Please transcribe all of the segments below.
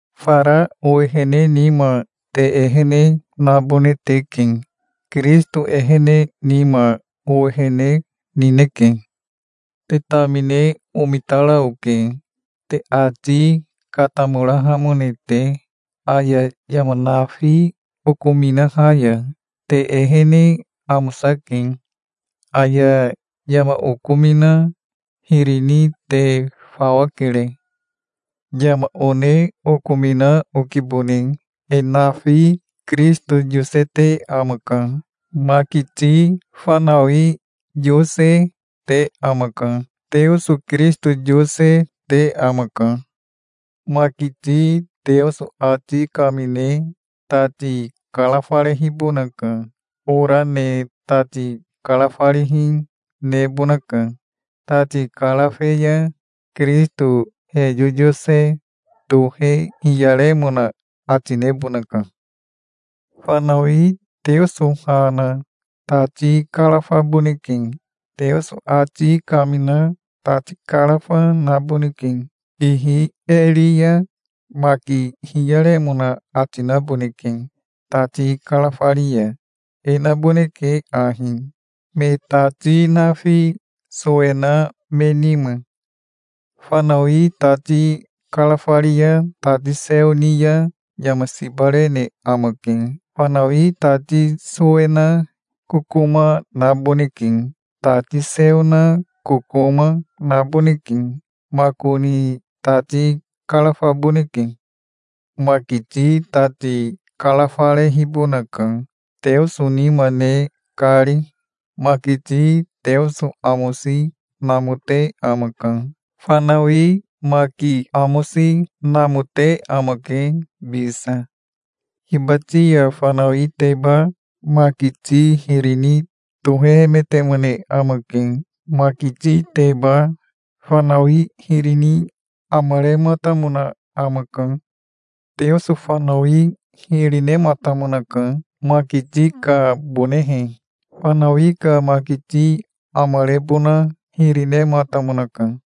Fara owehene nima te ehene nabone teke. Kirisito ehene nima owehene nineke. Te tamine omitara oke, te ati katamorahamone te, aya yama nafi okominaha ya. Te ehene amosake. Aya yama okomina hiri ni te fawa kere. Yama one okomina okibone. E nafi Kirisito yosete amaka. Makiti fanawi yose, te amaka. Teoso Kirisito yose, te amaka. Makiti Teoso ati kamine tati karafarehibonaka. Ora ne tati karafarihi nebonaka. Tati karafe ya Kirisito he yoyose tohe hiyaremona ati nebonaka. Fanawi Teoso ha na tati karafaboneke. Teoso ati kamina tati karafa naboneke. Ihi e ri ya maki hiyaremona ati naboneke. Tati karafari ya e naboneke ahi, me tati nafi sowe na me nima. Fanawi tati karafari ya tati seo ni ya yama siba rene amake. Fanawi tati sowe na kokoma naboneke. Tati seo na kokoma, naboneke. Makoni tati karafaboneke. Makiti tati karafarehibonaka, Teoso nima ne kari. Makiti Teoso amosi namote amaka. Fanawi maki amosi namote amake bisa. Hibati ya fanawiteba makiti hiri ni tohehemetemone amake. Makititeba fanawi hiri ni amarematamona amaka. Teoso fanawi hiri nematamonaka, makiti kabonehe. Fanawi ka makiti amarebona hiri nematamonaka.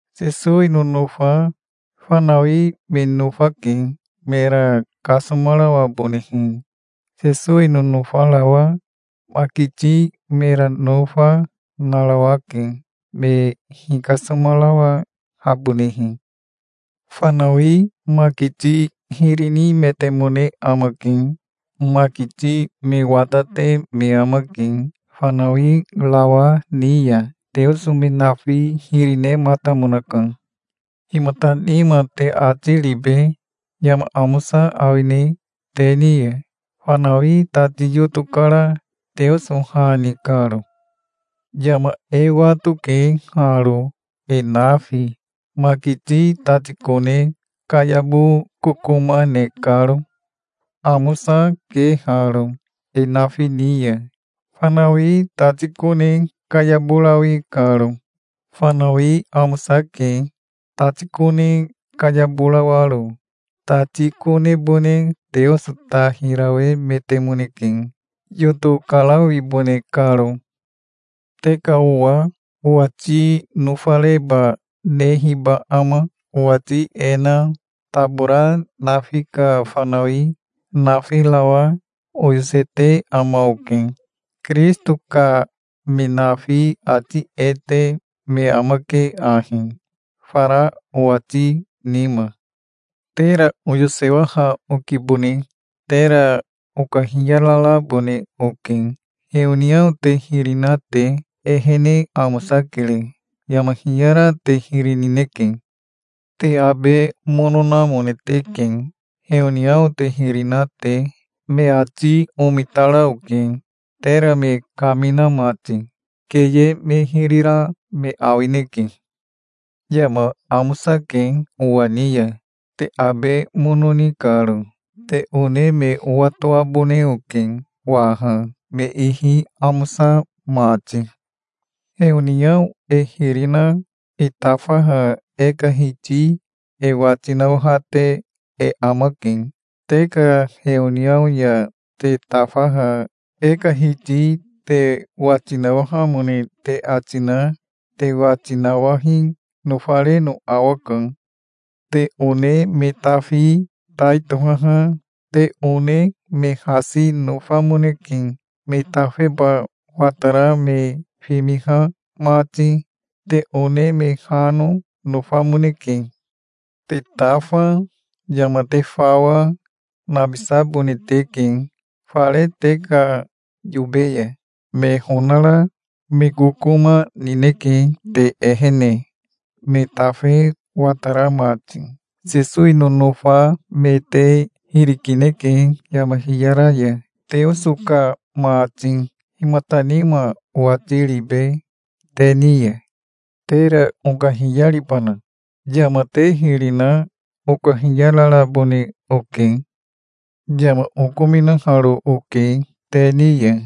Sesowi nonofa fanawi me nofake, mera kasomarawabonehe. Sesowi nonofarawa makiti mera nofa, narawake, me hikasomarawahabonehe. Fanawi makiti hiri nimetemone amake. Makiti me watate me amake fanawirawa ni ya. Teoso me nafi hiri nematamonaka. Himata nima te ati ribe? Yama amosa awine te ni ya, fanawi tati yoto kara Teoso ha ni karo? Yama e watoke haro e nafi, makiti tati kone kayabo kokoma ne karo. Amosa, ke haro e nafi ni ya, fanawi tati kone kayaborawi karo. Fanawi amosake, tati kone kayaborawaro. Tati konebone Teoso ta hirawemetemoneke, yoto karawibone karo. Te ka owa owati nofareba nehiba ama? Owati e na tabora nafi ka fanawi nafirawa oyosete ama oke. Kirisito ka me nafi ati e te me amake ahi fara owati nima. Tera oyosewaha okibone. Tera okahiyararabone oke. Heoniao te hiri na te ehene amosakere. Yama hiyara te hiri nineke. Te abe mono namone teke heoniao te hiri na te. Me ati omitara oke, tera me kamina mati. Keye me hiri ra me awineke. Yama amosake owa ni ya, te abe mono ni karo. Te one me owatoabone oke waha, me ihi amosa mati. Heoniao e hiri na e tafaha e ka Hiti e wati nawahate e amake. Te ka heoniao ya te tafaha e ka Hiti te wati nawahamone te ati na te wati nawahi nofareno awaka. Te one me tafi tai tohaha te one me hasi nofamoneke, me tafeba watara me fimiha mati. Te one me hano, nofamoneke. Te tafa, yama te fawa, nabisabone teke fare te ka yobe ya. Me honara me kokoma nineke te ehene, me tafe watara mati. Sesowi nonofa me te hiri kineke yama hiyara ya, Teoso ka mati. Himata nima owati ribe te ni ya? Tera okahiyaribana? Yama te hiri na okahiyararabone oke. Yama okominaharo oke te ni ya,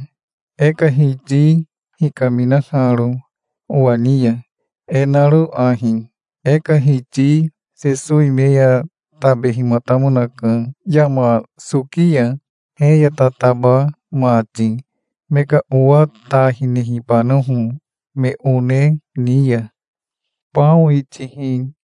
e ka Hiti hikaminaharo owa ni ya, e naro ahi: E ka Hiti Sesowi me ya tabehimatamonaka yama soki ya, he ya tataba mati, me ka owa ta hinehibanoho me one ni ya. Bao itihi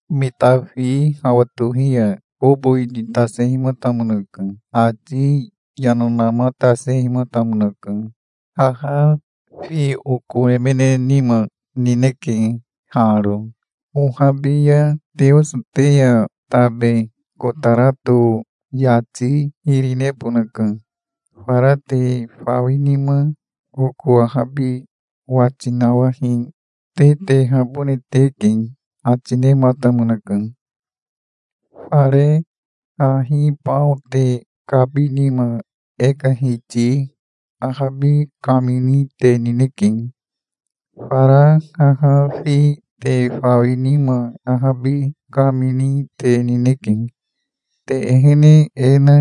Me tafi hawa tohi ya kobo ititasehimatamonaka. Ati yana namatasehimatamonaka. Haha fi oko emene nima nineke haro. Ohabi ya Teoso te ya tabe kotarato yati hiri nebonaka. Fara te fawi nima oko ahabi wati nawahi te tehabone teke, ati nematamonaka. Fare hahi bao te kabi nima e ka Hiti ahabi kamini te nineke. Fara haha fi te fawi nima ahabi kamini te nineke. Te ehene e na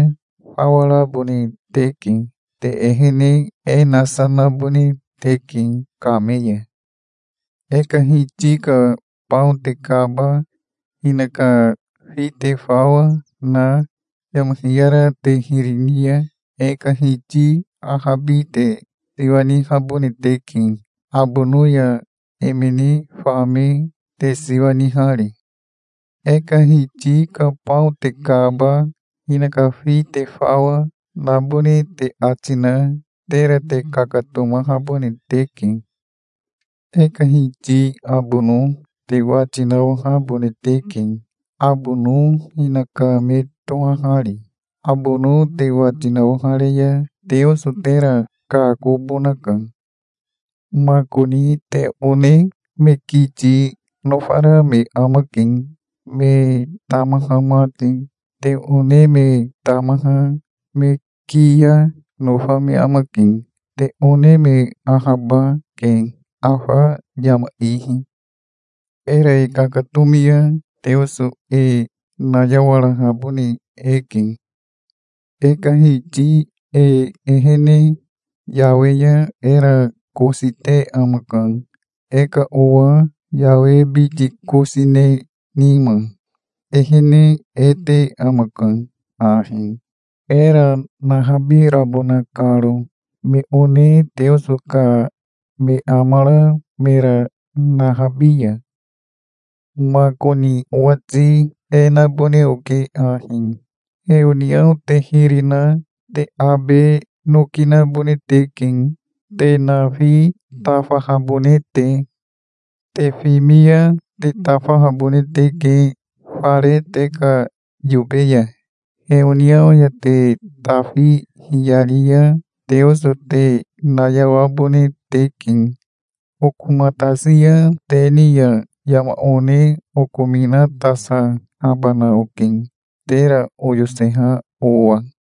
fawa rabone teke. Te ehene e nasa nabone teke kame ya. E ka Hiti ka bao te kaba, hinaka fi te fawa, na yama hiyara te hiri ni ya e ka Hiti ahabi te siwa nihabone teke, abono ya emene fame te siwa nihari. E ka Hiti ka bao te kaba, hinaka fi te fawa, nabone te ati na tera te kakatomahabone teke. E ka Hiti abono te wati nawahabone teke, abono hinaka me tohahari. Abono te wati nawahare ya Teoso tera kakobonaka. Makoni te one me kiti nofara me amake, me tamaha mati. Te one me tamaha me kiya, nofa me amake. Te one me ahaba, ke afa yama ihi. Era e kakatomi ya Teoso e nayawarahabone eke. E ka Hiti e ehene yawe ya era kosi te amaka, e ka owa yawe biti kosi ne nima. Ehene e te amaka ahi, era nahabirabona karo, me one Teoso ka me amara mera nahabi ya. Makoni owati e nabone oke ahi: Heoniao te hiri na te abe noki nabone teke, te nafi tafahabone te. Te fimi ya te tafahabone teke fare te ka yobe ya. Heoniao ya te tafi hiyari ya Teoso te nayawabone teke. Okomatasi ya te ni ya yama one okominatasahabana oke, tera oyoseha owa.